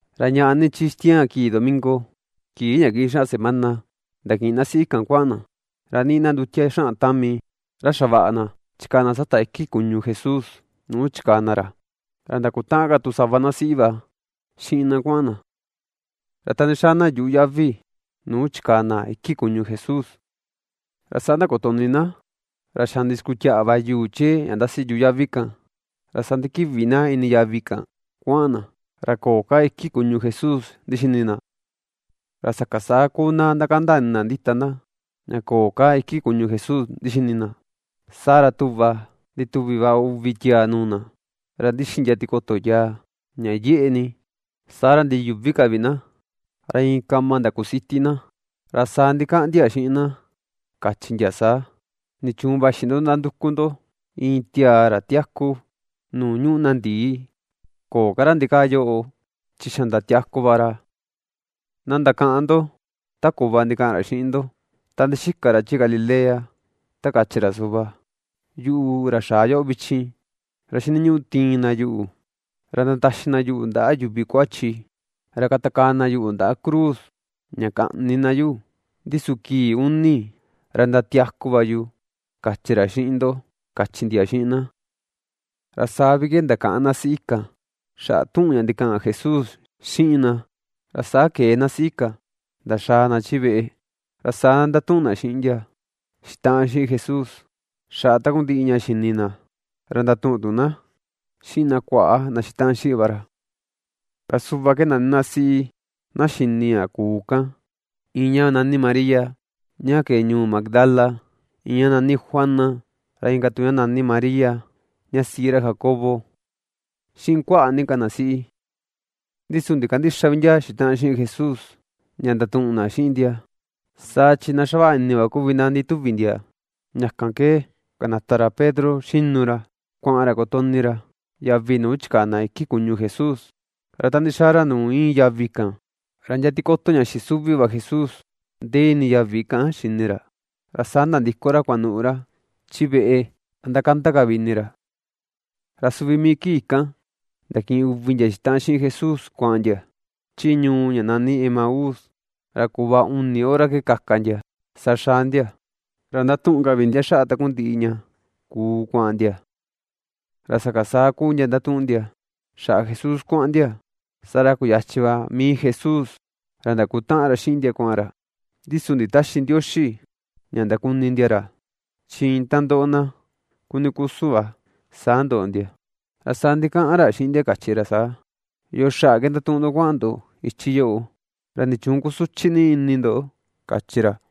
Ra naꞌa ni chi xitiaan kii domingo, kii ña kiꞌin xaꞌa semana, ndakiꞌin na siꞌi kan kuaꞌan na, ra niꞌi na ndutia xaꞌan tami ra xavaꞌa na chikaa na sata iki kuñu Jesús nuu chikaa na ra. Ra ndakutaꞌan ka tu sava na siꞌi va xiꞌin na kuaꞌan na. Ra ta ndixaa na yuꞌu yavi nuu chikaa na iki kuñu Jesús, ra saa ndakutoꞌni na xa ndixikutiaꞌa va yuu chee ña ndasi yuꞌu yavi kan. Ra saa ndikiꞌvi na ini yavi kan kuaꞌan na, ra köo ka iki kuñu Jesús ndixini na. Ra sakan saa kuu na ndakanda ini na ndita na, ña köo ka iki kuñu Jesús ndixini na, saa ra tuꞌva ndituvi va uvi tiaa nuu na, ra ndixi ndia tikoto yaa ña yeꞌe ni. Saa ra ndiyuꞌvi ka vi na, ra iin kama ndakusiti na. Ra saa ndikaꞌan ndia xiꞌin na, kachi ndia saa: ―¿Nichuun vaxi ndo ndanduku ndo iin tiaa ra tiaku nuu ñuꞌu na ndii? Köo ka ra ndikaa yoꞌo, chi xa ndatiaku va ra. Na ndakaꞌan ndo ta kuꞌva ndikaꞌan ra xiꞌin ndo, ta ndixika ra chi Galilea, ta kachi ra suꞌva: “Yuꞌu, ra xaa yoꞌo vichin, ra xiniñuꞌu tiin na yuꞌu, ra ndataxi na yuꞌu ndaꞌa yuvi kuachi, ra katakaa na yuꞌu ndaꞌa cruz, ña kaꞌni na yuꞌu, ndi su kii uni, ra ndiatiaku va yu”, kachi ra xiꞌin ndo ―kachi ndia xiꞌin na. Ra saa vi ke ndakaꞌan na siꞌi kan, xaꞌa tuꞌun ña ndikaꞌan Jesús xiꞌin na. Ra saa kee na siꞌi kan ndaxaa na chi veꞌe, ra saa ndatuꞌun na xiꞌin ndia xitaꞌan xiꞌin Jesús, xaꞌa takundiꞌi ña xini na, ra ndatuꞌun tu na xiꞌin na kuaꞌa na xitaꞌan xiꞌin va ra. Ra suꞌva ke nani na siꞌi na xini ña kuu kan: Iin ña nani María ña kee ñuu Magdala, iin ña nani Juana, ra inka tuku ña María ña siꞌi ra Jacobo, xiꞌin kuaꞌa ni ka na siꞌi. Ndi su ndikandïxa vi ndia xitaꞌan xiꞌin Jesús ña ndatuꞌun na xiꞌin ndia, saa chi na xavaꞌa ini va kuvi na ndituvi ndia. Ña kan ke kanata ra Pedro xinu ra kuaꞌan ra kotoꞌni ra yavi nuu chikaa na iki kuñu Jesús. Ra ta ndixaa ra nuu íin yavi kan, ra ndia tikoto ña xisuvi va Jesús ndee ini yavi kan xini ra, ra saa nandiko ra kuanuꞌu ra chi veꞌe ra ndakanda ka vi ini ra. Ra suvi mii kii kan ndakiꞌin uvi ndia xitaꞌan xiꞌin Jesús kuaꞌan ndia chi ñuu ña nani Emaús. Ra kuꞌva uni hora ke kaka ndia, saa xaa ndia. Ra ndatuꞌun ka vi ndia xaꞌa takundiꞌi ña kuu kuaꞌan ndia. Ra sakan saa kuu ndia ndatuꞌun ndia xaꞌa Jesús kuaꞌan ndia, saa ra kuyachin va mii Jesús ra ndakutaꞌan ra xiꞌin ndia kuaꞌan ra. Ndi su nditäxi Ndioxi ña ndakuni ndia ra, chi iin ta ndoꞌo na kuni kusun va, saa ndoꞌo ndia. Ra saa ndikaꞌan ra xiꞌin ndia, kachi ra saa: ―¿Yoo xaꞌa ke ndatuꞌun ndo kuaꞌan ndo ichi yoꞌo? ¿Ra nichuun kusuchi ni ini ndo? ―kachi ra.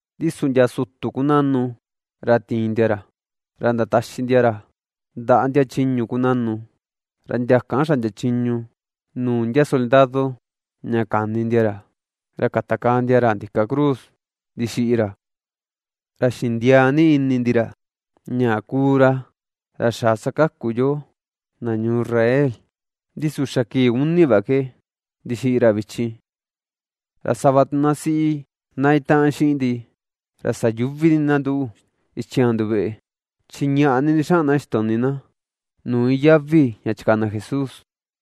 Ndi su ndia sutu kunaꞌnu, ra tiin ndia ra ra ndataxi ndia ra ndaꞌa ndia chiñu kunaꞌnu, ra ndia kan xaꞌndia chiñu nuu ndia soldado ña kani ndia ra, ra katakaa ndia ra ndika cruz ndixiꞌi ra. Ra xindiaa ni ini ndi ra ña kuu ra, ra xaa sakaku yoo, na ñuu Israel, ndi su xa kii uni va ke ndixiꞌi ra vichin. Ra sava tu na siꞌi na itaꞌan xiꞌin ndi ra sayuꞌvi ni na nduꞌu xitiaan nduveꞌe, chi ñaꞌa ni ndixaꞌan na xitoꞌni na nuu iin yavi ña chikaa na Jesús,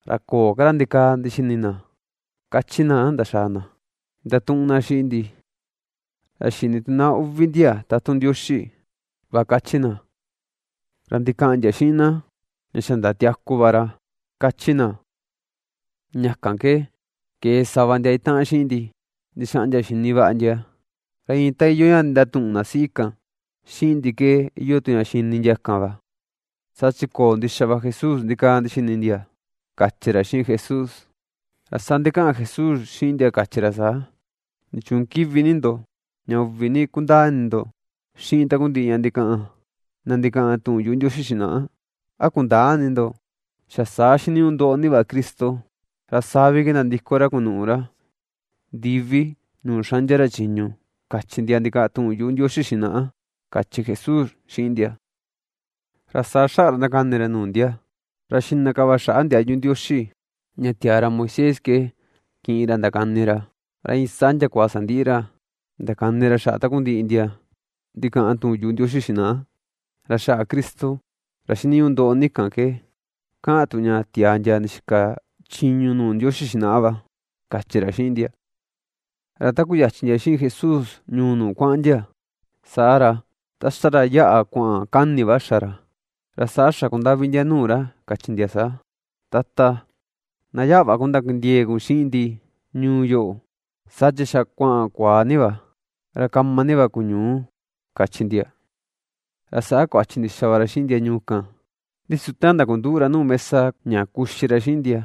ra köo ka ra ndikaa ndixini na, ^kachi na ndaxaa na ndatuꞌun na xiꞌin ndi, ra xini tu na uvi ndia tatun Ndioxi va kachi na, ra ndikaꞌan ndia xiꞌin na, ña xa ndatiaku va ra, kachi na. Ña kan ke kee sava ndia itaꞌan xiꞌin ndi ndixaꞌan ndia xini vaꞌa ndia, ra iin ta iyoo ña ndatuꞌun na siꞌi kan xiꞌin ndi ke iyoo tu ña xini ndia kan va, saa chi köo ndixa va Jesús ndikaa ndixini ndia, kachi ra, xiꞌin Jesús. Ra saa ndikaꞌan Jesús xiꞌin ndia, kachi ra saa: ―¿Nichuun kiꞌvi ni ndo, ña uꞌvi ni kundaa ini ndo xiꞌin takundiꞌi ña ndikaꞌan na ndikaꞌan tuꞌun yuꞌu Ndioxi xinaꞌa? A kundäa ini ndo, xa saa xiniñuꞌu ndoꞌo ni va Cristo. Ra saa vi ke nandiko ra kunuꞌu ra ndivi nuu xaꞌndia ra chiñu, kachi ndia ndikaꞌan tuꞌun yuꞌu Ndioxi xinaꞌa ―kachi Jesús xiꞌin ndia. Ra saa xaꞌa ra ndakani ra nuu ndia, ra xiꞌna ka xaꞌa ndiayu Ndioxi ña tiaa ra Moisés ke kiꞌin ra ndakani ra, ra iin saa ndiakua sandiꞌi ra ndakani ra xaꞌa takundiꞌi ndia ndikaꞌan tuꞌun yuꞌu Ndioxi xinaꞌa, ra xaꞌa Cristo ra xiniñuꞌu ndoꞌo ni kan ke kaꞌan tu ña tiaa ndia ndixika chiñu nuu Ndioxi xinaꞌa va, kachi ra xiꞌin ndia. Ra ta kuyachin ndia xiꞌin Jesús ñuu nuu kuaꞌan ndia, saa ra, ta ^xa ra yaꞌa kuaꞌan kani va xa ra, ra saa xakundaꞌvi ndia nuu ra, kachi ndia saa: ―Tata, na yaꞌa va kun ndakindiee kun xiꞌin ndi ñuu yoꞌo. Saa chi xa kuaꞌan kuaa ni va, ra kama ni va ku ñuu ―kachi ndia. Ra saa kuachi ndixa va ra xiꞌin ndia ñuu kan. Ndi su ta ndakunduꞌu ra nuu mesa ña kuxi ra xiꞌin ndia,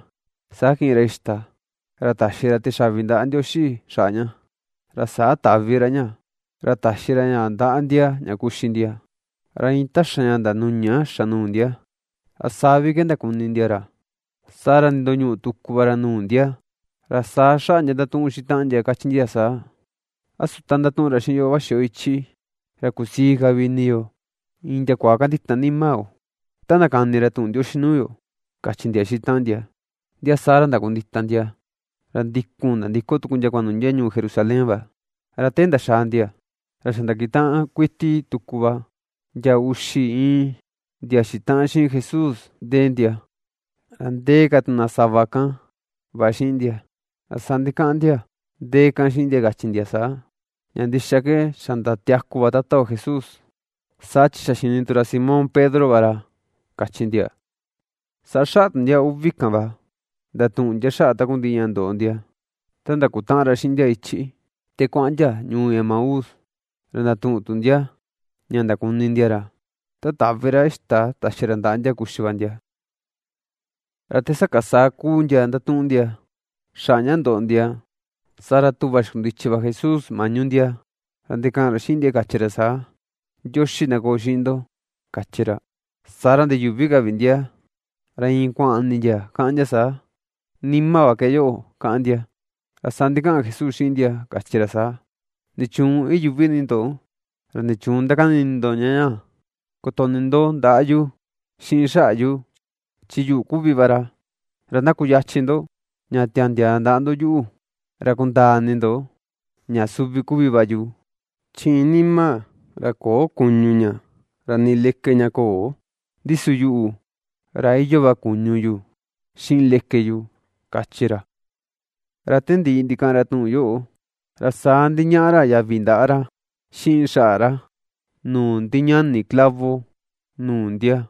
saa kiꞌin ra xita, ra taxi ra tixaꞌvi ndaꞌa Ndioxi xaꞌa ña, ra saa taꞌvi ra ña, ra taxi ra ña ndaꞌa ndia ña kuxi ndia. Ra iin ta xa ña ndanuña xa nuu ndia, ra saa vi ke ndakuni ndia ra. Saa ra nindoñuꞌu tuku va ra nuu ndia. Ra saa xaꞌa ndia ndatuꞌun ndia xiꞌin taꞌan ndia, kachi ndia saa: ―¿A su ta ndatuꞌun ra xiꞌin yo vaxi ra ichi, ra kusii ka vi ini yo iin ndiakua kandita nima yo ta ndakani ra tuꞌun Ndioxi nuu yo? ―kachi ndia xiꞌin taꞌan ndia. Ndia saa ra ndakuita ndia, ra ndikun nandiko tuku ndia kuanuꞌu ndia ñuu Jerusalén va. Ra te ndaxaa ndia ra xa ndakutaꞌan kuiti tuku va ndia uxi iin ndia xitaꞌan xiꞌin Jesús ndee ndia, ra ndee ka tu na sava kan va xiꞌin ndia. Ra saa ndikaꞌan ndia ndee kan xiꞌin ndia, kachi ndia saa: ―Ña ndixa ke xa ndatiaku va Tata yo Jesús, saa chi xa xini tu ra Simón Pedro va ra ―kachi ndia. Saa xaꞌa tu ndia uvi kan va ndatuꞌun ndia xaꞌa takundiꞌi ña ndoꞌo ndia ta ndakutaꞌan ra xiꞌin ndia ichi, ta kuaꞌan ndia ñuu Emaús. Ra ndatuꞌun tu ndia ña ndakuni ndia ra ta taꞌvi ra xita taxi ra ndaꞌa ndia kuxi va ndia. Ra te sakan saa kuu ndia ndatuꞌun ndia xaꞌa ña ndoꞌo ndia, saa ra tuꞌva xikundichi va Jesús maꞌñu ndia, ra ndikaꞌan ra xiꞌin ndia, kachi ra saa: ―Ndioxi na koo xiꞌin ndo ―kachi ra. Saa ra ndiyuꞌvi ka vi ndia, ra iin kuaꞌan ini ndia, kaꞌan ndia saa: “Nima va ke yoꞌo”, kaꞌan ndia. Ra saa ndikaꞌan Jesús xiꞌin ndia, kachi ra saa: ―¿Nichuun iyuꞌvi ni ndo? ¿Ra nichuun ndakani ini ndo ña ñaa? Kotoꞌni ndo ndaꞌa yu xiꞌin xaꞌa yu, chi yuꞌu kuvi va ra, ra na kuyachin ndo ña tandiaa ndaꞌa ndo yuꞌu, ra kundaa ini ndo ña suvi kuvi va yu. Chi iin nima ra köo kuñu ña ra nii leke ña köo. Ndi su yuꞌu, ra iyoo va kuñu yu xiꞌin leke yu ―kachi ra. Ra ta ndiꞌi ndikaꞌan ra tuꞌun yoꞌo, ra saa ndiñaꞌa ra yavi ndaꞌa ra xiꞌin xaꞌa ra nuu ndiñani clavo nuu ndia.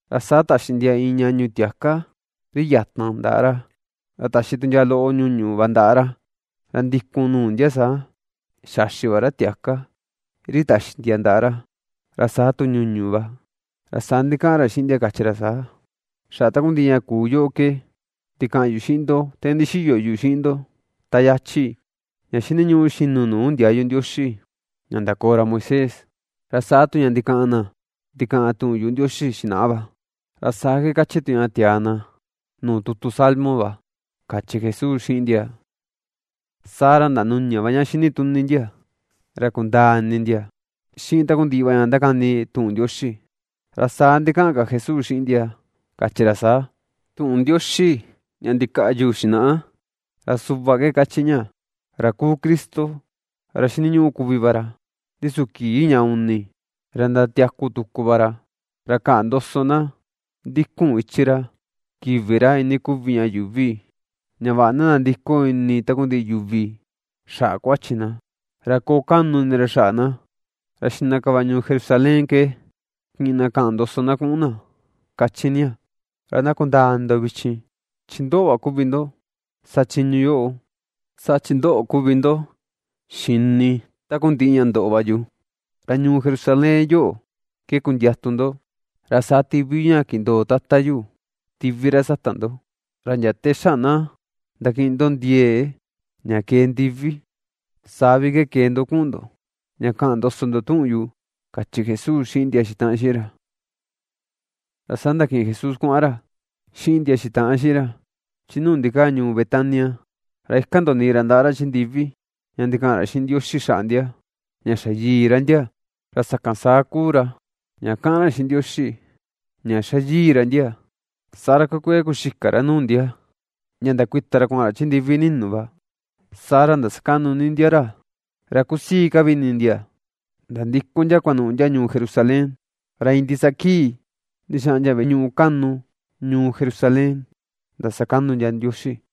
Ra saa taxi ndia iin ñaꞌñu tiaka ri yatan ndaꞌa ra, ra taxi tu ndia loꞌo ñuñu va ndaꞌa ra. Ra ndikun nuu ndia saa xaxi va ra tiaka ri taxi ndia ndaꞌa ra, ra saa tu ñuñu va. Ra saa ndikaꞌan ra xiꞌin ndia, kachi ra saa: ―Xaꞌa takundiꞌi ña kuu yoꞌo ke ndikaꞌan yu xiꞌin ndo te ndixiyo yu xiꞌin ndo ta yachi: ña xiniñuꞌu xinu nuu ndiayu Ndioxi ña ndakoo ra Moisés, ra saa tu ña ndikaꞌan na ndikaꞌan tuꞌun yuꞌu Ndioxi xinaꞌa va, ra saa ke ^kachi tu ña tiaa na nuu tutu Salmo va ―kachi Jesús xiꞌin ndia. Saa ra ndanuña va ña xini tuni ndia, ra kundaa ini ndia xiꞌin takundiꞌi va ña ndakani tuꞌun Ndioxi. Ra saa ndikaꞌan ka Jesús xiꞌin ndia, kachi ra saa: ―Tuꞌun Ndioxi ña ndikaꞌyu xinaꞌa ra suꞌva ke kachi ña: ra kuu Cristo, ra xiniñuꞌu kuvi va ra, ndi su kii ña uni ra ndatiaku tuku va ra; ra kaꞌan ndoso na ndikun ichi ra kivi ra iinii kuvi ña yuuvi, ña vaꞌa na nandiko ini takundiꞌi yuvi xaꞌa kuachi na, ra koo kaꞌnu ini ra xaꞌa na, ra xiꞌna ka va ñuu Jerusalén ke kiꞌin na kaꞌan ndoso na kuꞌun na, kachi ña. Ra na kundaa ini ndo vichin, chi ndoꞌo va kuvi ndo sa chiñu yoꞌo, saa chi ndoꞌo kuvi ndo xini takundiꞌi ña ndoꞌo va yu. Ra ñuu Jerusalén yoꞌo ke kundiatu ndo, ra saa tiꞌvi yu ña kindoo Tata yu tiꞌvi ra sata ndo, ra ndia ta xa na ndakiꞌin ndo ndiee ña kee ndivi, saa vi ke kee ndo kuꞌun ndo ña kaꞌan ndoso ndo tuꞌun yu ―kachi Jesús xiꞌin ndia xitaꞌan xiꞌin ra. Ra saa ndakiꞌin Jesús kuaꞌan ra xiꞌin ndia xitaꞌan xiꞌin ra chi nuu ndikaa ñuu Betania, ra ikan ndoniꞌi ra ndaꞌa ra chi ndivi, ña ndikaꞌan ra xiꞌin Ndioxi xaꞌa ndia ña xa yii ra ndia. Ra sakan saa kuu ra ña kaꞌan ra xiꞌin Ndioxi ña ^xa yii ra ndia, saa ra kuee kuee kuxika ra nuu ndia ña ndakuita ra kuaꞌan ra chi ndivi ninu va. Saa ra ndasakaꞌnu ni ndia ra, ra kusii ka vi ini ndia nandiko ndia kuanuꞌu ndia ñuu Jerusalén. Ra iin ndisaa kii ndixaꞌan ndia veꞌe ñuꞌu kaꞌnu ñuu Jerusalén ndasakaꞌnu ndia Ndioxi.